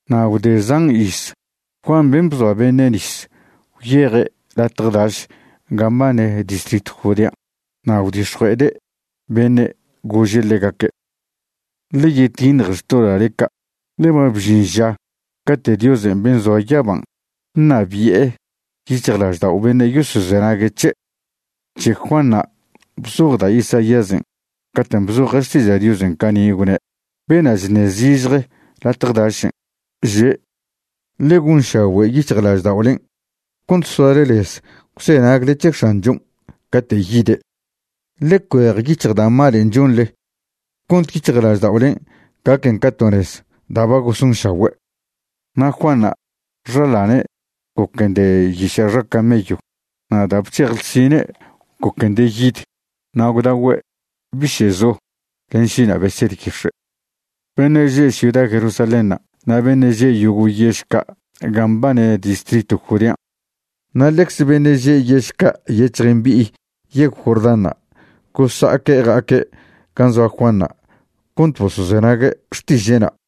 Na' gwde zan iz, Juan ben' bzoa beṉe' nis gwyeje' latje daš gan' mbane distritw Judean'. Na' gwdix̱jue'ede' beṉe', gože' ḻegaque': ―Ḻe yetiṉje xtoḻa'le ca', ḻe ba bžin ža cate' Diosen' ben' zoa yaban' ṉabi'e yic̱hjlaždao' beṉe' yosozenague' c̱he'. C̱he Juanṉa' bzoj da' Isaíasen' caten' bzoje' Xtiža' Diosen' cani', gwne': Bena' chṉe' zižje latje dašen', že': “Ḻe gonšagüe' yic̱hjlažda'olen' cont soale lez gwzenagle c̱he X̱anchon' cate' yide'. Ḻe cuejyic̱hj da' malen' chonḻe cont yic̱hjlažda'olen' gaquen ca to nez da' ba gosonšagüe'.” Na' Juanṉa', xaḻane' goquen de yiša' xa camello. Na' da' bc̱hej ḻsinen' goquen de yid, na' gwdagüe' biše'zo len šina' beser yix̱e'. Beṉe' že' ciuda Jerusalénṉa' na' beṉe' že' yogo' yež ca' gan' mbane distritw Judean', na' ḻecze beṉe' že' yež ca' nyec̱hj mbi'i yegw Jordánṉa' gosa'aque' ja'aque' gan' zoa Juanṉa' cont bosozenague' xtiže'na'.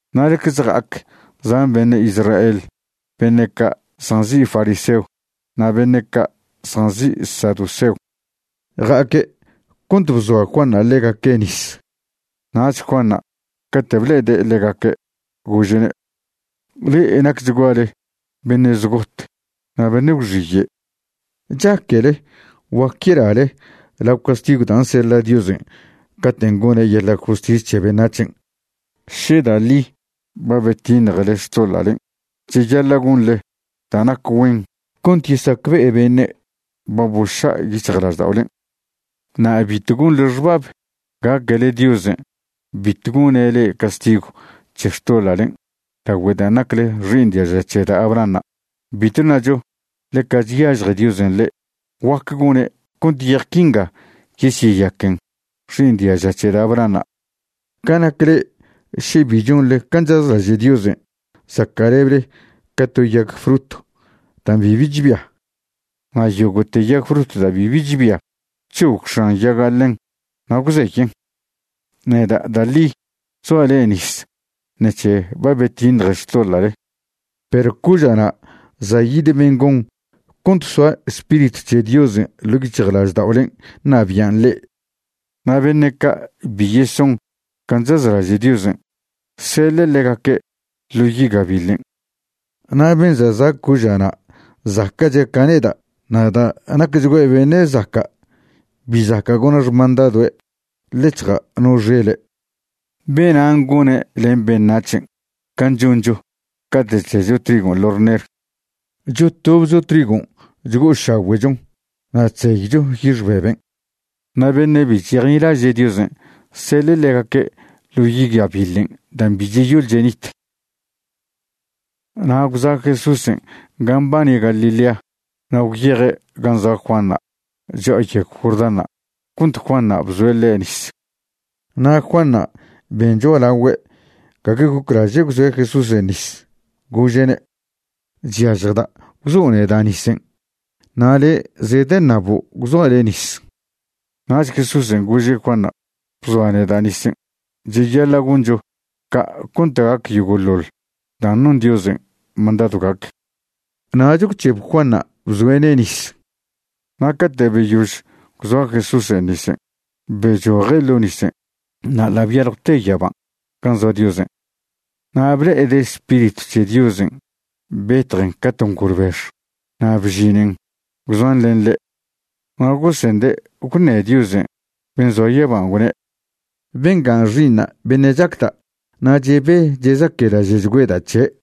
Na' ḻecze ja'ac zan beṉe' Israel beṉe' ca' zjanzi' fariseo na' beṉe' ca' zjanzi' saduseo. Ja'aque' cont bzoa Juanṉa' ḻegaque' nis. Nach Juanṉa' cate' ble'ede' ḻegaque' gože'ne': ―¡Ḻe'e nacchguale beṉe' zgot na' beṉe' gwxiye'! ¿Chaquele guac yelale lao castigw dan' seḻa' Diosen' caten' gone' yeḻa' justis c̱he beṉac̱hen'? Še da' ḻi ba betiṉjele xtoḻa'len', cheyaḻa' gonḻe da' nac güen cont yesacbe'e beṉe' ba boša' yic̱hjlažda'olen'. Na' bitw gonḻe xbab gaquele Diosen' bitw gone' le'e castigw c̱he xtoḻa'len' lagüe dan' nacle xi'iṉ diaža c̱he da' Abrahanṉa'. Bitw ṉacho ḻeca chyažje Diosen' le'e. Guac gone' cont yej quinga yesyeyaquen xi'iṉ diaža c̱he da' Abrahanṉa'. Ca nac le'e, še bi chonḻe can' chazlaže' Diosen', zaca'leble ca to yag frut da' bibi chbia. Na' yogo'te yag frut da' bibi chbia, c̱hog x̱an yaga' ḻen na' gwzeyen'. Neda' da' ḻi chzoa' le'e nis ṉec̱he ba betiṉje xtoḻa'le, perw coža'na' za' yid ben' gon cont soa Spiritw c̱he Diosen' ḻo' yic̱hjlažda'olen' ṉabian' le'e. Na' beṉe' ca' bi yeson can' chazlaže' Diosen', seḻe' ḻegaque' ḻo yi' gabiḻen'. Na' ben' za' za' coža'na' zaca'che' ca neda' na' da' nacchgüe' beṉe' zaca', bi zaca' gona' xmandadoe' ḻec̱hja' no xele'. Benan' gone' len beṉac̱hen' can' choncho cate' chdecho trigon' ḻo' rner. Chotobcho trigon' chgo'ošagüe'chon na' chzeycho yix beben'. Na' beṉe' bi chesejnilaže' Diosen', seḻe' ḻegaque' ḻo yi' gabiḻen' dan' cbi cheyol chenit. Na' gwza' Jesúsen' gan' mbane Galilea na' gwyeje' gan' zoa Juanṉa' cho'a yegw Jordánṉa' cont Juanṉa' bzoe' ḻe' nis. Na' Juanṉa' ben cho'alagüe' gague goclaže' gwzoe' Jesúsen' nis, gože'ne': ―Chyažjda' gwzo' neda' nisen' na' le' zedeṉabo' gwzoa' le' nis. Nach Jesúsen' gože' Juanṉa': ―Bzoa neda' nisen'. Cheyaḻa' goncho ca' cont gac yogo'ḻoḻ dan' non Diosen' mandadw gac. Nach gwc̱heb Juanṉa' bzoe'ne' nis. Na' cate' beyož gwzoa Jesúsen' nisen', bechoje' ḻo' nisen', na' ḻa' byaljwte yaban' gan' zoa Diosen'. Na' ble'ede' Spiritw c̱he Diosen' betjen ca to ngolbex na' bžinen gwzoan len ḻe'. Na' gosende' gwṉe Dios ben' zoa yaban', gwne': ―Bengan' Xi'iṉa' beṉe' chacda' na' chebe chezaquelaže'chgüeda' c̱he'.